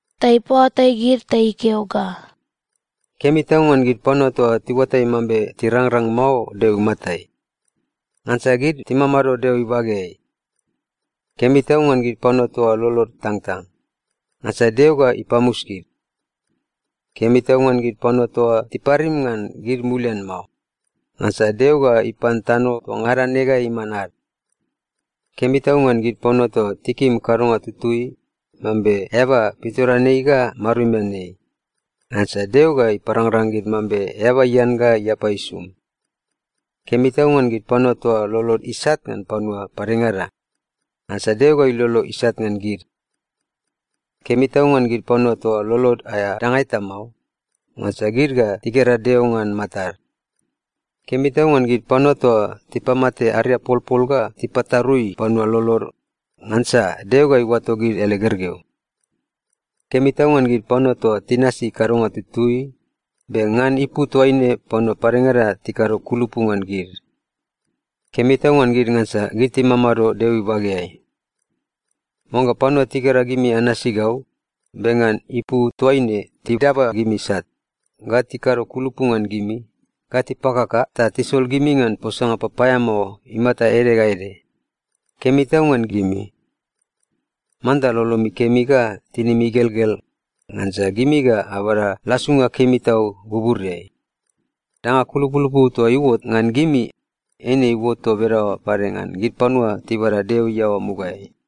ta ipaoatai gid ta ikeo ga, “Kemi tau ngan gid panua toa tiuatai mambe tirangrang mao Deo imatai! Ngansa gid timamado Deo ibageai. Kemi tau ngan gid panua toa lolod itangtang! Ngansa Deo ga ipamus gid. Kemi tau ngan gid panua toa tiparim ngan gid mulian mao! Ngansa Deo ga ipan tano toa ngada ne ga iman ad. Kemi tau ngan gid panua toa tikim kadonga tutui, mambe eaba pitoreanei ga marumian ei! Ngansa Deo ga iparangrang gid mambe eaba ian ga iapa isum. Kemi tau ngan gid panua toa lolod isat ngan panua padengada! Ngansa Deo ga ilolo isat ngan gid. Kemi tau ngan gid panua toa lolod aea danga eta mao! Ngansa gid ga tigera Deo ngan matad. Kemi tau ngan gid panua toa tipamate ariapolpol ga tipatarui panua lolod! Ngansa Deo ga iuato gid ele gergeu. Kemi tau ngan gid panua toa tinasi kadonga tutui, be ngan ipu toaine panua padengada tikado kulupu ngan gid! Kemi tau ngan gid, ngansa gid timamado Deo ibageai. “Oangga panua tigera gimi anasi gau, be ngan ipu toaine tidaba gimi sat, ga tikado kulupu ngan gimi, ga tipakaka ta tisol gimi ngan posanga papaeamao imata ede ga ede, kemi tau ngan gimi! Manta lolomi kemi ga tinimi igelgel, ngansa gimi ga abada lasunga kemi tau buburiai. Danga kulupulupu toa iuot ngan gimi, eine iuot toa bedaoa pade ngan gid panua tibada Deo iaoa mugaeai.”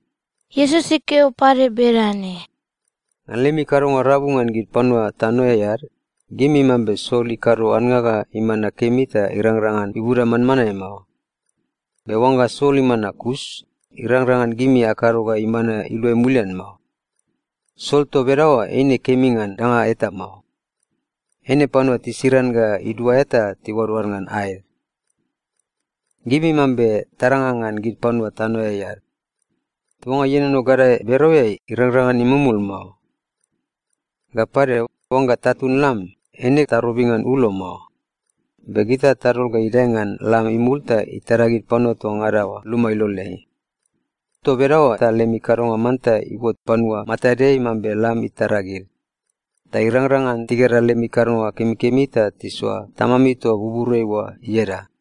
Iesus ikeo pade bedane, “Ngan lemi kadonga rabu ngan gid panua tanoeai ad, gimi mambe sol ikado annga ga imana kemi ta irangrang ngan ibuda manmanae mao. Be oangga sol imana kus, irangrang ngan gimi akado ga imana iluai mulian mao. Sol toa bedaoa eine kemi ngan danga eta mao. Eine panua tisiran ga iduaea ta tiuadoad ngan aed. “Gimi mambe taranga ngan gid panua tanoeai ad. Tuanga ienono gadae bereoeai irangrang ngan imumul mao. Ga pade, oangga tatun lam, eine tarobi ngan ulo mao. Be gita tadol ga idae ngan lam imul ta itara gid panua toa ngada oa luma iloleai. Toa bedaoa ta lemi kadonga manta iuot panua matadeai, mambe lam itara gid. Ta irangrang ngan tigera lemi kadonga kemikemi ta tisoa Tamami toa buburiai oa ieda.”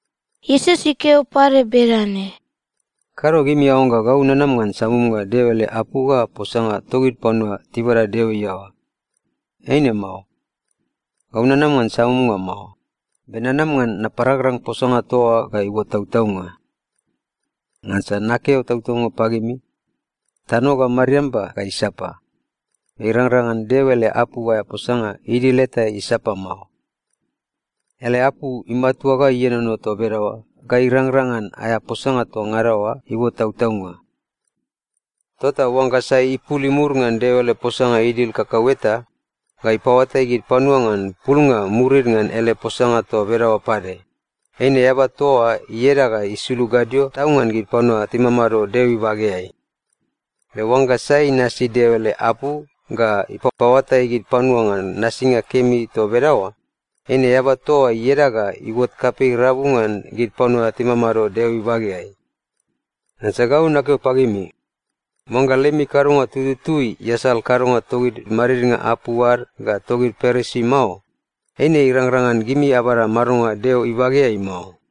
Iesus ikeo pade bedane, “Kado gimi aoangga gau nanama ngan samumnga Deo ele apu ga posanga togid panua tibada Deo iaoa. Eine mao. Gau nanama ngan samumnga mao, be nanama ngan naparangrang posanga toa oa ga iuot tautaunga. Ngansa nakeo tautaunga pagimi, tano ga mariamba ga isapa, be irangrang ngan Deo ele apu aea posanga idil eta isapa mao. Ele apu imatua ga ienono toa bedaoa ga irangrang ngan aea posanga toa ngada oa iuot tautaunga. Tota oangga sai ipul imur ngan Deo ele posanga idil kakau eta, ga ipaoatai gid panua ngan pulnga murid ngan ele posanga toa bedaoa pade, eine eaba toa oa ieda ga isulug gadio tau ngan gid panua timamado Deo ibageai. Be oangga sai inasi Deo ele apu ga ipapaoatai gid panua ngan nasinga kemi toa bedaoa, eine eaba toa oa ieda ga iuot kapei rabu ngan gid panua timamado Deo ibageai. Ngansa gau nakeo pagimi, oangga lemi kadonga tututui iasal kadonga togid madidnga apu ad ga togid Parisi mao, eine irangrang ngan gimi abada madonga Deo ibageai mao.”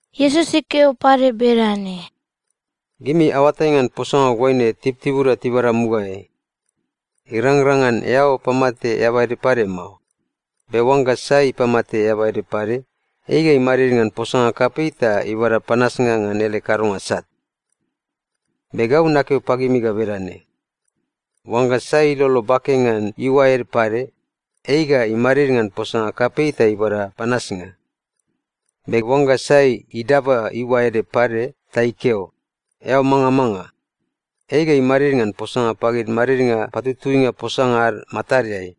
Iesus ikeo pade bedane, “Gimi aoatai ngan posanga ga oaine tibutibuda tibada mugaeai, ‘Irangrang ngan eao pamate eaba ede pade mao. Be oangga sai ipamate eaba ede pade, ei ga imadid ngan posanga kapei ta ibada panasnga ngan ele kadonga sat.’ Be gau nakeo pagimi ga bedane: Oangga sai ilolo bake ngan iuae ede pade, ei ga imadid ngan posanga kapei ta ibada panasnga. Be oangga sai idaba iuae ede pade ta ikeo, ‘Eao mangamanga!’ ei ga imadid ngan posanga pagid madidnga patutuinga posanga ad matadeai.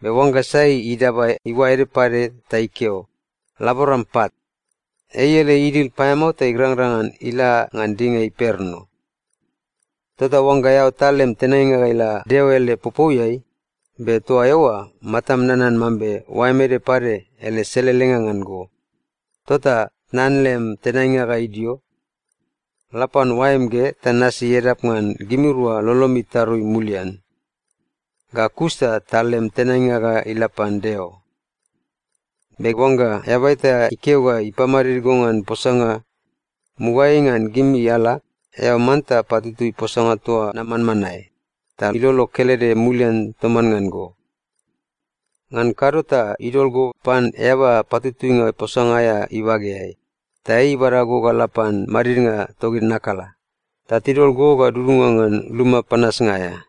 Be oangga sai idaba iuae ede pade ta ikeo, ‘Laboram pat!’ ei ele idil paeamao ta irangrang ngan ila ngan dinga imperno. “Tota oangga eao tal lem tenainga ga ila Deo ele popouiai, be toa eoa matam nanan mambe oaem ede pade ele selelenga ngan go, tota tnan lem tenainga ga idio. La pan oaem ge ta nasi edap ngan gimirua lolomi itarui mulian. Ga kus ta tal lem tenainga ga ila pan Deo. “Be oangga eaba eta ikeo ga ipamadid go ngan posanga, mugaeai ngan gimi ala, eao manta patutui posanga toa na manmanae, ta ilolo kelede mulian toman ngan go. Ngan kado ta idol go pan eaba patutuinga posanga aea ibageai, ta ei ibada go ga la pan madidnga togid nakala, ta tidol go ga dudunga ngan luma panasnga aea.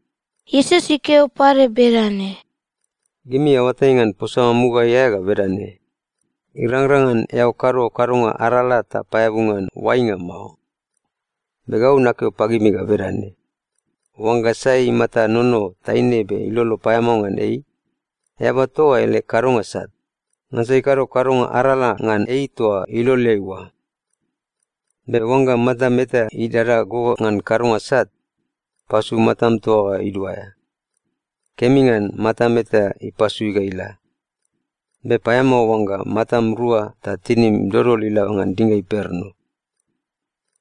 Iesus ikeo pade bedane, “Gimi aoatai ngan posanga mugaeai aea ga bedane, ‘Irangrang ngan eao kado kadonga arala ta paeabu ngan oainga mao.’ Be gau nakeo pagimi ga bedane: Oangga sai imata inono taine be ilolo paeamao ngan ei, eaba toa oa ele kadonga sat, ngansa ikado kadonga arala ngan ei toa iloleai oa. “Be oangga matam eta idada go ngan kadonga sat, pasu matam toa ga iduaea. Kemi ngan matam eta ipasui ga ila. Be paeamao oangga matam rua ta tinim dodol ila ngan dinga imperno.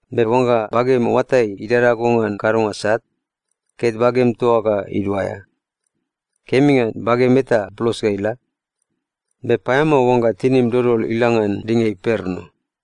Be oangga bagem oatai idada go ngan kadonga sat, ket bagem toa ga iduaea. Kemi ngan bagem eta blos ga ila. Be paeamao oangga tinim dodol ila ngan dinga imperno.”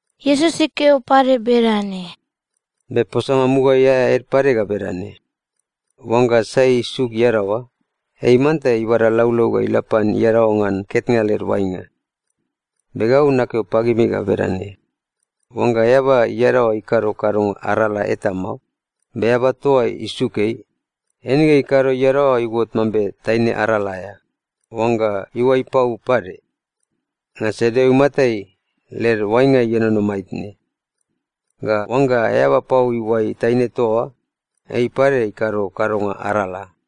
Iesus ikeo pade bedane, “Be posanga mugaeai aea ede pade ga bedane, ‘Oangga sai isuk iadaoa, ei manta ibada laulau ga ila pan iadaoa ngan ketnga led oainga.’ Be gau nakeo pagimi ga bedane: Oangga eaba iadaoa ikado kadonga arala eta mao, be eaba toa oa isuk ei, eine ikado ga iadaoa iuot mambe taine arala aea (oangga iuai pau pade). Ngansa Deo imatai, led oainga ienono maitne. Ga oangga eaba pau iuai taine toa oa, ei pade ikado kadonga arala.”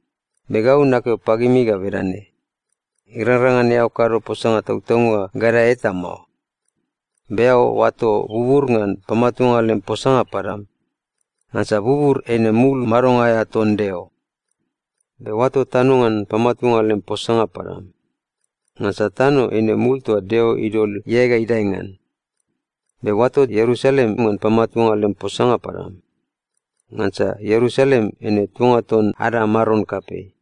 Be gau nakeo pagimi ga bedane: Irangrang ngan eao kado posanga tautaunga gadae eta mao. Be eao oato bubur ngan pamatuanga lem posanga padam. Ngansa bubur eine mul madonga aea ton Deo. Be oato tano ngan pamatuanga lem posanga padam. Ngansa tano eine mul toa Deo idol iae gadae ngan. Be oato Ierusalem ngan pamatuanga lem posanga padam. Ngansa Ierusalem eine tuanga ton ada Maron kapei.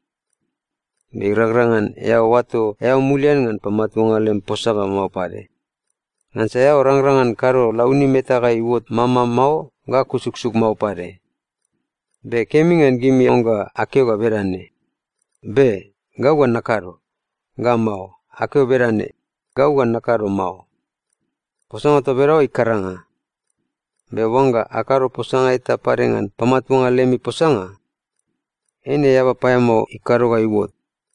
Be irangrang ngan eao oato eao mulian ngan pamatuanga lem posanga mao pade. Ngansa eao rangrang ngan kado launim eta ga iuot mama mao ga kusuksuk mao pade. Be kemi ngan gimi oangga akeo ga bedane, ‘Be. Gau ga nakado.’ Ga mao, akeo bedane, ‘Gau ga nakado mao.’ Posanga toa bedaoa ikaranga. Be oangga akado posanga eta pade ngan pamatuanga lemi posanga, eine eaba paeamao ikado ga iuot.”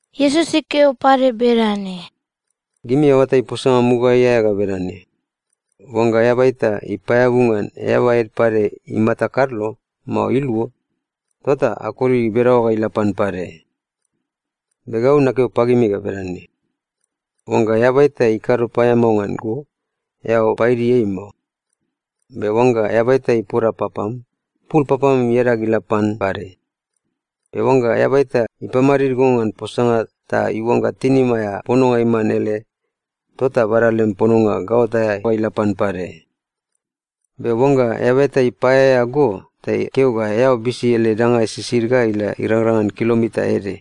Iesus ikeo pade bedane, “Gimi aoatai posanga mugaeai aea ga bedane, ‘Oangga eaba eta ipaeabu ngan eaba ede pade imata kadlo mao iluo, tota akoli bedaoa ga ila pan pade.’ Be gau nakeo pagimi ga bedane: Oangga eaba eta ikado paeamao ngan go, eao paidi ei mao. Be oangga eaba eta ipoda papam, pul papam iadag ga ila pan pade. Be oangga eaba eta ipamadid go ngan posanga ta iuangga tinim aea pononga iman ele, tota bada lem pononga gaot aea ga ila pan pade. Be oangga eaba eta ipaeaea go ta ikeo ga eao bisi ele danga sisid ga ila irangrang ngan kilomita ede,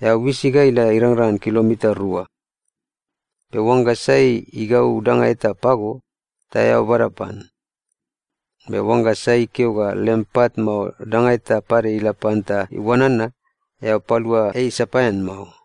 eao bisi ga ila irangrang ngan kilomita rua. Be oangga sai igau danga eta pago, ta eao bada pan. Be oangga sai ikeo ga lem pat mao danga eta pade ila pan ta iuanana, eao palua ei sapaean mao.”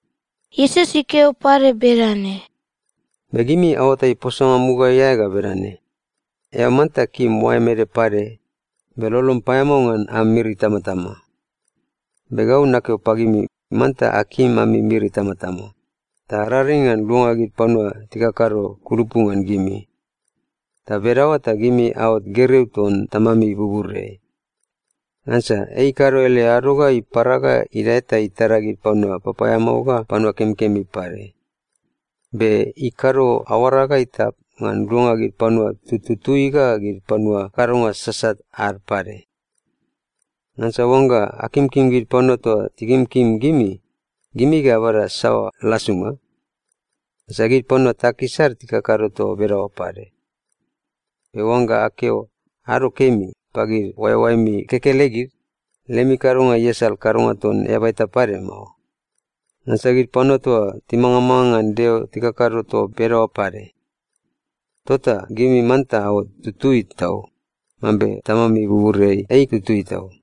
Iesus ikeo pade bedane, “Be gimi aoatai posanga mugaeai aea ga bedane, ‘Eao manta kim oaem ede pade, be lolom paeamao ngan am miri itamatama.’ Be gau nakeo pagimi, manta akim ami miri itamatama. Ta araring ngan luanga gid panua tikakado kulupu ngan gimi. Toa bedaoa ta gimi aot gergeu ton Tamami buburiai. Ngansa ei ikado ele ado ga ipara ga idae ta itara gid panua papaeamao ga panua kemikemi pade. Be ikado aoara ga itap ngan luanga gid panua tututui ga gid panua kadonga sasat ad pade. Ngansa oangga akimkim gid panua toa tikimkim gimi, gimi ga abada saoa lasunga? Ngansa gid panua takis ad tikakado toa bedaoa pade. Be oangga akeo ‘ado kemi’ pagid oaeoaemi kekelegid, lemi kadonga iasal kadonga ton eaba eta pade mao. Ngansa gid panua toa timangamanga ngan Deo tikakado toa bedaoa pade. Tota gimi manta aot tutui tau, mambe Tamami buburiai ei tutui tau.”